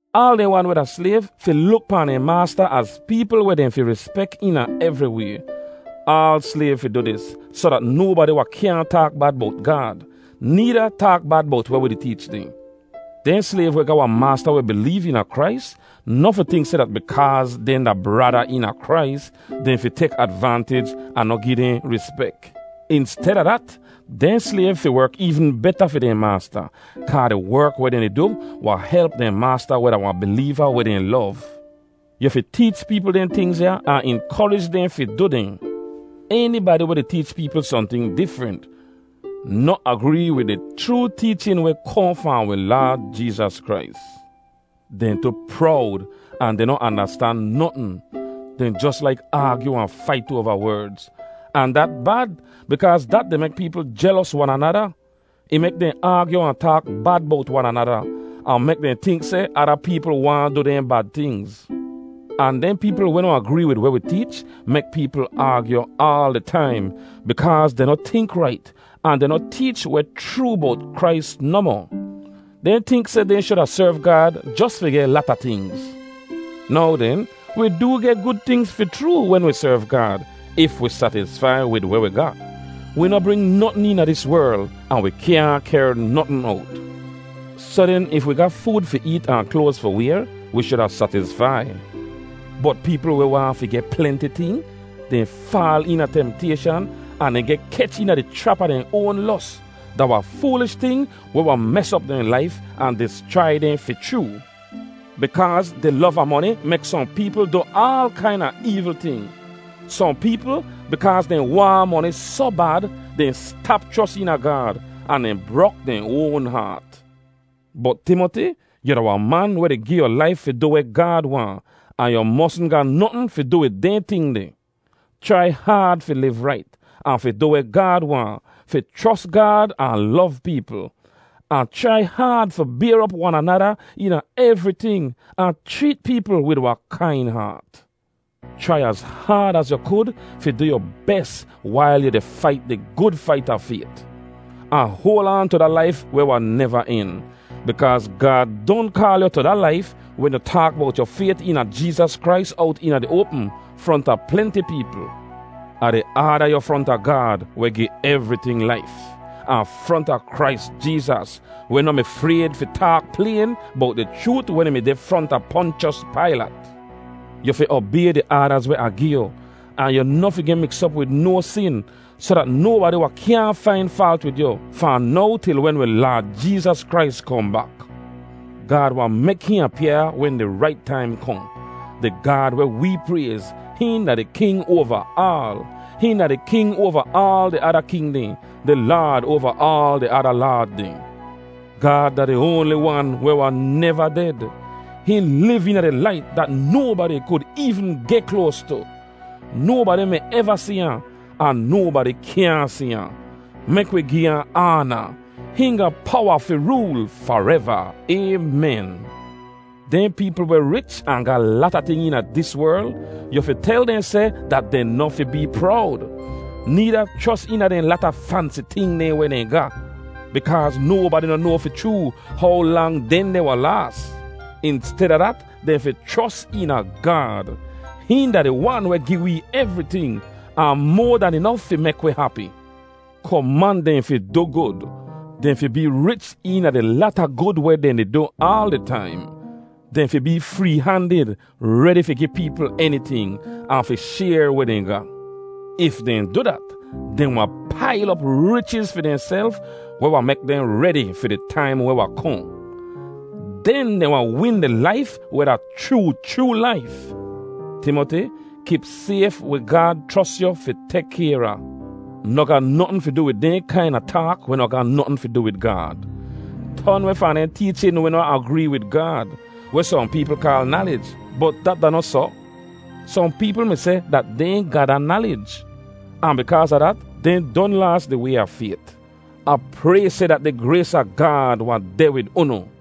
Aal dehn wan weh da slayv fi luk pahn dehn maasta az peepl weh dehn fi rispek eena evri way. Aal slayv fi du dis, soh dat nobadi wahn kyaahn taak bad bowt Gaad, needa taak bad bowt weh wi di teech dehn. Dehn slayv weh ga wahn maasta weh bileev eena Krais noh fi tink seh dat bikaaz dehn da brada eena Krais, dehn fi tek advantij ahn noh gi dehn rispek. Insteda dat, dehn slayv fi werk eevn beta fi dehn maasta, kaa di werk weh dehn di du wahn help dehn maasta weh da wahn bileeva weh dehn lov. Yu fi teech peepl dehn tingz ya ahn inkorij dehn fi du dehn. Enibadi weh di teech peepl sohnting difrent, noh agree wid di chroo teechin weh kohn fahn wi Laad Jeezas Krais. Dehn tu prowd, ahn dehn noh andastan notn. Dehn jos laik aagyu ahn fait oava werdz. Ahn dat bad, bikaaz dat di mek peepl jelos wan anada. Ih mek dehn aagyu ahn taak bad bowt wan anada, ahn mek dehn tink seh ada peepl waahn du dehn bad tingz. Ahn dehn peepl weh noh agree wid weh wi teech mek peepl aagyu aal di taim bikaaz dehn noh tink rait ahn dehn noh teech weh chroo bowt Krais nohmoh. Dehn tink seh dehn shuda serv Gaad jos fi geh lata tingz. Now den, wi doo geh gud tingz fi chroo wen wi serv Gaad, if wi satisfai wid weh wi ga. Wi noh bring notn eena dis werl, ahn wi kyaahn kehr notn owt. Soh den, if wi ga food fi eet ahn kloaz fi wayr, wi shuda satisfai. Bot peepl weh waahn fi geh plenti ting, dehn faal eena temtayshan ahn dehn geh kech eena di chrap a dehn oan los. Da wahn foolish ting weh wahn mes op dehn laif ahn dischrai dehn fi chroo. Bikaaz di lov a moni mek sohn peepl du aal kaina eevl ting. Sohn peepl, bikaaz dehn waahn moni soh bad, dehn stap chros eena Gaad, ahn dehn brok dehn oan haat. Bot Timoti, yu da wahn man weh di gi yu laif fi du weh Gaad waahn, ahn yu mosn ga notn fi du wid dehn ting deh. Chrai haad fi liv rait, ahn fi du weh Gaad waahn, fi chros Gaad ahn lov peepl. Ahn chrai haad fi bayr op wan anada eena evriting ahn chreet peepl wid wahn kain haat. Chrai az haad az yu kud fi du yu bes wail yu di fait di gud fait a fayt. Ahn hoal aan tu da laif weh wahn neva en. Bikaaz Gaad don kaal yu tu da laif wen yu taak bowt yu fayt eena Jeezas Krais owt eena di oapm, fronta plenti peepl. Ah di aada yu fronta Gaad, weh gi evriting laif, ahn fronta Krais Jeezas, weh noh mi frayd fi taak playn bowt di chroot wen ih mi deh fronta Ponchos Pailat. Yu fi obay di aadaz weh Ah gi yu, ahn yu noh fi geh miks op wid no sin, soh dat nobadi wahn kyaahn fain faalt wid yu, fahn now til wen wi Laad Jeezas Krais kohn bak. Gaad wahn mek hihn apyaa wen di rait taim kohn. Di Gaad weh wee prayz, hihn da di King oava aal. Hihn da di King oava aal di ada king dehn, di Laad oava aal di ada laad dehn. Gaad da di oanli wan weh wahn neva ded. Hihn liv eena di lait dat nobadi kud eevn geh kloas tu. Nobadi mi eva si ahn, ahn nobadi kyaahn si ahn. Mek wi gi ahn aana. Hihn ga powa fi rool fareva. Aymen. Dehn peepl weh rich ahn ga lata ting eena dis werl, yu fi tel dehn seh dat dehn noh fi bee prowd, needa chros eena dehn lata fansi ting dehn weh dehn ga. Bikaaz nobadi noh noa fi chroo how lang dehndeh wahn laas. Insteda dat, dehn fi chros eena Gaad. Hihn da di Wan weh gi wee evriting, ahn moa dan inof fi mek wi hapi. Koman dehn fi du gud. Dehn fi bee rich eena di lata gud weh dehn di du aal di taim. Dehn fi bee free-handid, redi fi gi peepl eniting, ahn fi shayr weh dehn ga. If dehn du dat, dehn wahn pail op richiz fi dehnself weh wahn mek dehn redi fi di taim weh wahn kohn. Den dehn wahn win di laif weh da chroo chroo laif. Timoti, kip sayf weh Gaad chros yu fi tek kayr a. Noh ga notn fi du wid dehn kaina taak weh noh ga notn fi du wid Gaad. Ton weh fahn dehn teechin weh noh agree wid Gaad, weh sohn peepl kaal “nalij,” bot dat da noh soh. Sohn peepl mi seh dat dehn ga da “nalij,” ahn bikaaz a dat, dehn don laas di way a fayt. Ah pray seh dat di grays a Gaad wahn deh wid unu.